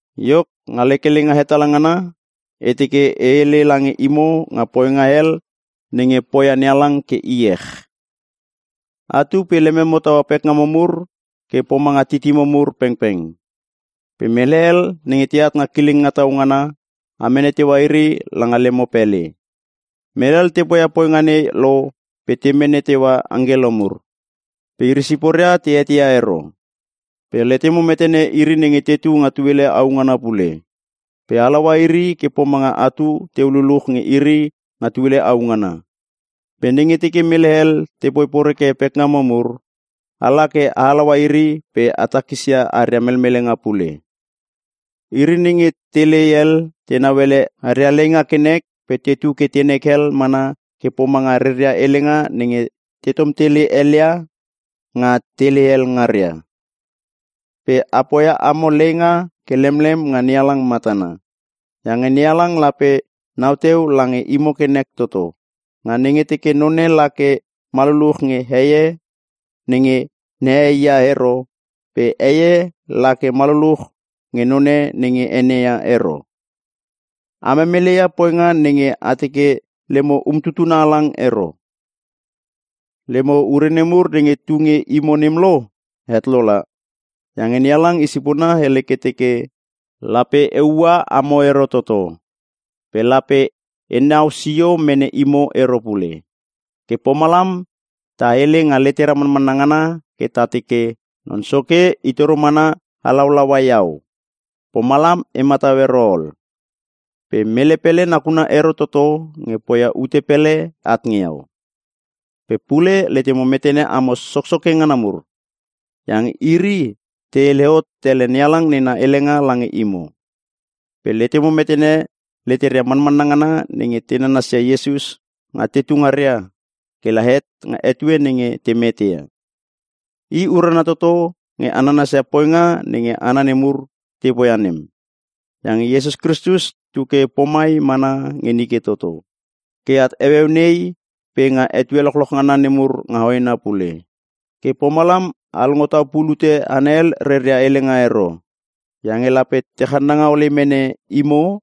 Iok, nga lek helenga hetala ngana, e teke e hele lange imo nga poinga hel nenge poia NeHalang ke iech. Atu pe lememo taua pekgamo mur ke pomanga titimo mur pengpeng. Pe mele hel nenge teat nga kileng tau ngana, a mene teua iri langa lemo pele. Mele hel te poia poinga nei lo pe te mene teua angkelo mur. Pe iri siporia te eteia ero. Pe letemo metene iri nenge tetu nga tuele au ngana pule. Pe a halaua iri ke pomanga atu teu luluch nge iri nga tuele au ngana. Pe nenge teke mele hel te poi poreke pekngamo mur, ala ke a halaua iri pe a takisia aria melmelenga pule. Iri nenge telei hel, tenau ele aria leinga ke nek pe tetu ke tenek hel mana ke pomanga reria helenga nenge tetom tele helia nga telei hel ngaria. Pe a poia amo leinga ke lemlem nga NeHalang matana. Iange NeHalang lape nau teu lange imo ke nek toto, nga nenge teke none la ke ma luluch nge heie nenge nehei ia ero pe heie la ke ma luluch nge none nge ene ia ero. A memelei ia poinga nenge a teke lemo umtutuna halang ero. Lemo ure nemur nenge tu nge imo nem lo, het lo la. Iange NeHalang I sipona hele ke teke, “Lape E ua amo ero toto. Pe lape E nau sio mene imo ero pule.” Ke pomalam ta hele nga letera manmanna ngana ke ta teke, “Non Soke i toro mana halaulaua iau. Pomalam e matau ero ol. Pe mele pele nakuna ero toto nge poia ute pele at nge iau.” Pe pule letemo metene amo soksoke ngana mur. Iange iri te hele hot tele NeHalang nena helenga lange imo. Pe letemo metene leteria manmanna ngana nenge te nanasia Iesus nga tetu ngaria, ke la het nga etue nenge te mete ia. I urana toto nge a nanasia poinga nenge hana nemur te poia nem. Iange Iesus Kristus tu ke pomai mana nge nike toto, ke at heueu nei pe nga etue lochloch ngana nemur nga hoena pule. Ke pomalam a longo tau pulute hana hel reria helenga ero. Iange lape te channanga ole mene imo,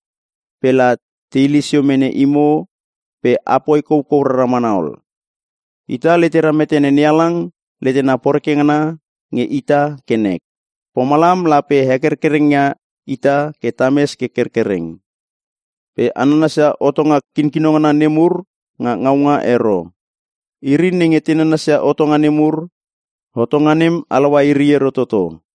pe la te hile sio mene imo pe a poi koukou rara mana ol. Ita letera metene NeHalang letena poreke ngana nge ita ke nek. Pomalam lape hekerkereng ia ita ke tames ke kerkereng. Pe a nanasia hotonga kinkino ngana nemur nga ngaunga ero. Iri nenge te nanasia hotonga nemur, hotonga nem halaua iri ero toto.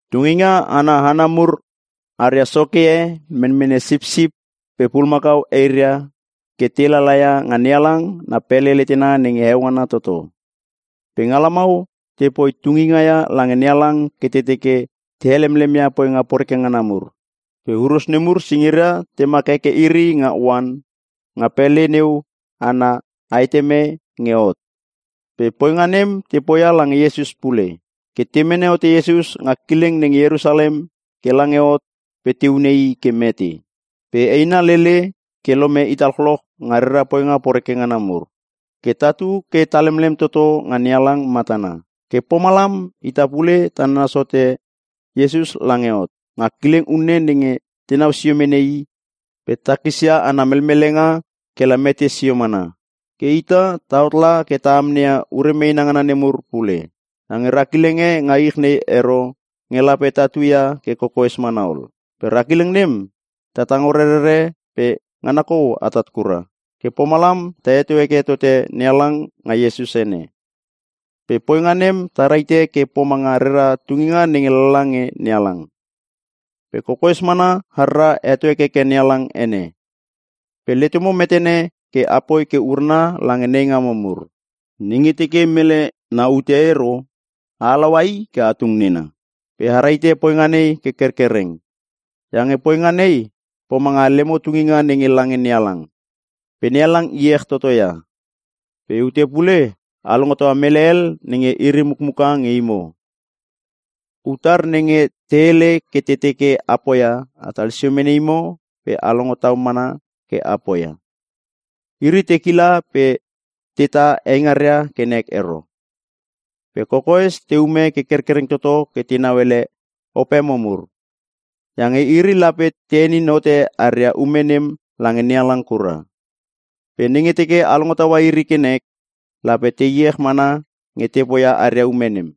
Tunginga ana hana mur aria soke e menmene sipsip pe pulumakau eiria ke te lalaia nga NeHalang na pele letena nenge heo ngana toto. Pe nga lamau te poi tunginga ia lange NeHalang ke te teke te helemlem ia poinga poreke ngana mur. Pe huros nemur singiria temak heke iri nga oan, nga pele neu ana aeteme nge hot. Pe poinga nem te poia lange Iesus pule. Ke te mene hote Iesus nga kileng nenge Ierusalem ke lange hot pe te hune i ke mete. Pe eina lele ke lome ita lochloch nga rera poinga poreke ngana mur. Ke tatu ke ta lemlem toto nga NeHalang matana. Ke pomalam, ita pule ta nanas hote Iesus lange hot. Nga kileng unne nenge tenau sio mene I pe takisia ana melmelenga ke la mete sio mana. Ke ita, tahot la ke ta amneia ure meena ngana nemur pule. Iange ra kileng e nga ich nei ero nge lape tatu ia ke kokoes mana ol. Pe ra kileng nem, ta tango rerere pe ngana kou atat kura. Ke pomalam ta heto heke tote NeHalang nga Iesus ene. Pe poinga nem ta rahite ke pomanga rera tungina nenge lala nge NeHalang. Pe kokoes mana harra heto hekeke NeHalang ene. Pe letemo metene ke apoi ke urana lange nei ngamo mur. Nenge teke mele na ute ero, a halaua i ke a tung nena. Pe a rahite poinga nei ke kerkereng. Iange poinga nei, pomanga lemo tunginga nenge lange NeHalang. Pe NeHalang iech toto ia. Pe ute pule, a longo taua mele hel nenge iri mukmuka nge imo. Utar nenge te hele ke te teke a poia, atal sio mene imo pe a longo tau mana ke a poia. Iri, te kila pe teta eingaria ke nek ero, pe kokoes te ume ke kerkereng toto ke tenau ele opemo mur. Iange iri lape te henin hote aria ume nem lange NeHalang kura. Pe nenge teke a longo taua iri ke nek, lape te iech mana nge te poia aria ume nem.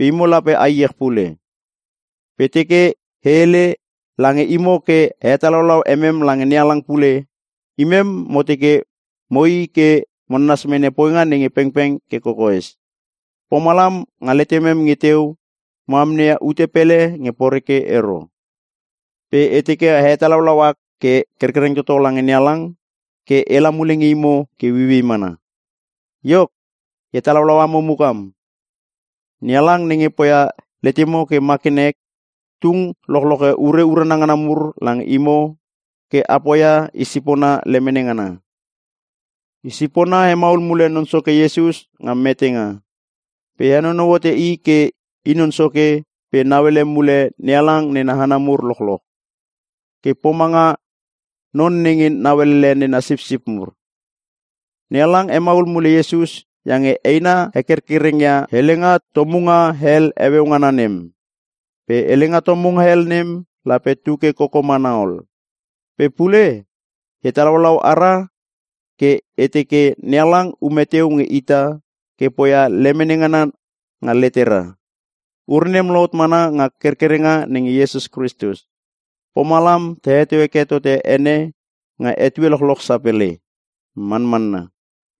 Pe imo lape a iech pule. Pe e teke e hele lange imo ke a hetalau emem lange NeHalang pule. Imem mo teke moi ke mo nanas mene poinga nge pengpeng ke kokoes. Pomalam, nga letemem nge teu, mo amneia ute pele nge poreke ero. Pe e teke a hetalaulau ak ke kerkereng toto lange NeHalang ke ela mule nge imo ke ueiuei mana. Iok, e hetalaulau amo mukam: NeHalang nenge poia letemo ke ma ke nek, tung lochloche ure urana ngana mur lange imo ke a poia i sipona lemene ngana. I sipona hemaul mule Non Soke Iesus nga metenga. Pe henonou hote I ke I Non Soke pe nauele mule NeHalang nena hana mur lochloch. Ke pomanga non nenge nauelele nena sipsip mur. NeHalang hemaul mule Iesus iange eina hekerkereng ia helenga tomunga hel heueu ngana nem. Pe helenga tomunga hel nem, lape tu ke koko mana ol. Pe pule, e hetalaulau ara ke e teke NeHalang ume teu nge ita ke poia lemene ngana nga letera. Ure nem lohot mana nga kerkerenga nenge Iesus Kristus! Pomalam ta heto heke tote ene nga etue lochloch sapele. Manmanna!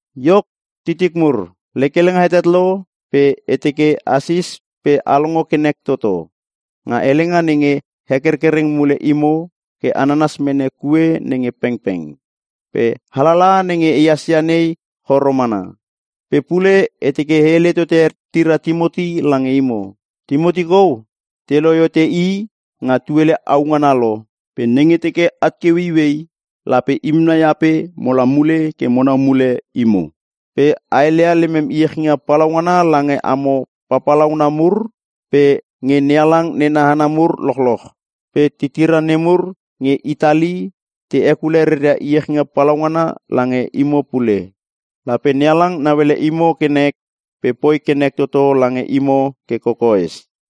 Iok titik mur, lek helenga hetet lo pe e teke asis pe a longo ke nek toto, nga helenga nenge hekerkereng mule imo ke a nanas mene kue nenge pengpeng. Pe alalaha nenge ehas ia nei choro mana. Pe pule e teke e hele tote tira Timoti lange imo. Timoti kou te lohe hote i nga tuele au ngana lo. Pe nenge teke at ke ueiuei, lape imem nai ape mola mule ke monau mule imo. Pe a heleia lemem iechinga palaungana lange amo papalauna mur, pe nge NeHalang nena hana mur lochloch. Pe titira nemur nge Itali te hekule reria iechinga palaungana lange imo pule. Lape NeHalang nauele imo ke nek, pe poi ke nek toto lange imo ke kokoes.